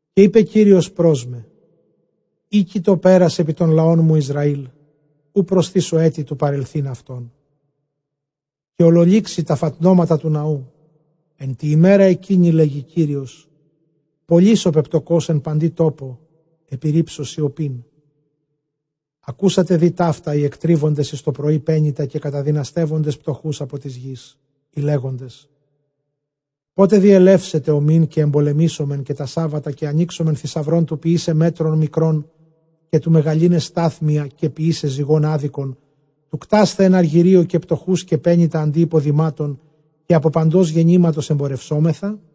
καὶ εἶπε Κύριος πρὸς μὲ, ἥκει τὸ πέρας ἐπὶ τὸν λαόν μου Ἰσραὴλ, οὐ προσθήσω ἔτι τοῦ παρελθεῖν αὐτόν. Καὶ ὀλολύξει τὰ φατνώματα τοῦ ναοῦ ἐν τῇ ἡμέρᾳ ἐκείνῃ, λέγει Κύριος Κύριος· πολὺς ὁ πεπτωκὼς ἐν παντὶ τόπῳ, ἐπιῤῥίψω σιωπήν. Ἀκούσατε δὴ ταῦτα οἱ ἐκτρίβοντες εἰς τοπρωῒ πένητα, καὶ καταδυναστεύοντες πτωχοὺς ἀπὸ τῆς γῆς, λέγοντες, πότε διελεύσεται ὁ μὴν, καὶ ἐμπολήσομεν, καὶ τὰ σάββατα, καὶ ἀνοίξομεν θησαυρὸν τοῦ ποιῆσαι μέτρον μικρὸν, καὶ τοῦ μεγαλῦναι στάθμιον, καὶ ποιῆσαι ζυγὸν ἄδικον, τοῦ κτᾶσθαι ἐν ἀργυρίῳ καὶ πτωχοὺς, καὶ πένητα ἀντὶ ὑποδημάτων, καὶ ἀπὸ παντὸς γεννήματος ἐμπορευσόμεθα.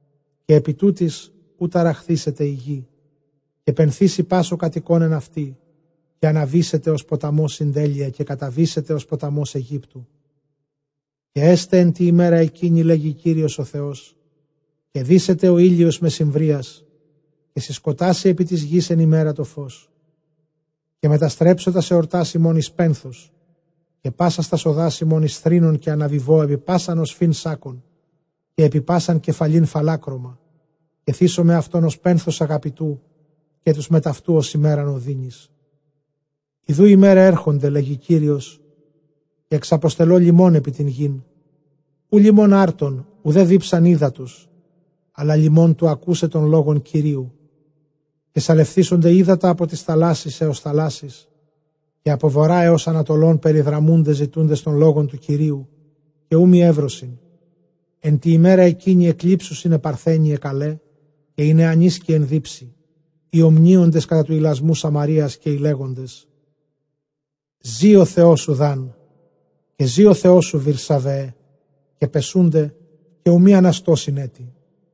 Καὶ ἐπὶ τούτοις οὐ ταραχθήσεται ἡ γῆ, καὶ πενθήσει πᾶς ὁ κατοικῶν ἐν αὐτῇ; καὶ ἀναβήσεται ὡς ποταμὸς συντέλεια, καὶ καταβήσεται ὡς ποταμὸς Αἰγύπτου. Καὶ ἔσται ἐν τῇ ἡμέρᾳ ἐκείνῃ, λέγει Κύριος Κύριος, δύσεται ὁ ἥλιος μεσημβρίας, καὶ συσκοτάσει ἐπὶ τῆς γῆς ἐν ἡμέρᾳ τὸ φῶς, καὶ μεταστρέψω τὰς ἑορτὰς ὑμῶν εἰς πένθος, καὶ πάσας τὰς ᾠδὰς ὑμῶν εἰς θρῆνον, καὶ ἀναβιβῶ ἐπὶ πᾶσαν ὀσφὺν σάκκον, καὶ ἐπὶ πᾶσαν κεφαλὴν φαλάκρωμα· καὶ θήσομαι αὐτὸν ὡς πένθος ἀγαπητοῦ, καὶ τοὺς μετʼ αὐτοῦ ὡς ἡμέραν ὀδύνης. Ἰδοὺ ἡμέραι ἔρχονται, λέγει Κύριος, καὶ ἐξαποστελῶ λιμὸν ἐπὶ τὴν γῆν, οὐ λιμὸν ἄρτων, οὐδὲ δίψαν ὕδατος, ἀλλὰ λιμὸν τοῦ ἀκοῦσαι τὸν λόγον Κυρίου. Καὶ σαλευθήσονται ὕδατα ἀπὸ τῆς θαλάσσης ἕως θαλάσσης, καὶ ἀπὸ Βοῤῥᾶ ἕως ἀνατολῶν περιδραμοῦνται ζητοῦντες τὸν λόγον τοῦ Κυρίου, καὶ οὐ μὴ εὕρωσιν. Ἐν τῇ ἡμέρᾳ ἐκείνῃ ἐκλείψουσιν αἱ παρθένοι αἱ καλαὶ, καὶ οἱ νεανίσκοι ἐν δίψει, οἱ ὀμνύοντες κατὰ τοῦ ἱλασμοῦ Σαμαρείας, καὶ οἱ λέγοντες, ζῇ ὁ θεός σου Δὰν, καὶ ζῇ ὁ θεός σου Βηρσαβεέ· καὶ πεσοῦνται, καὶ οὐ μὴ ἀναστῶσιν ἔτι.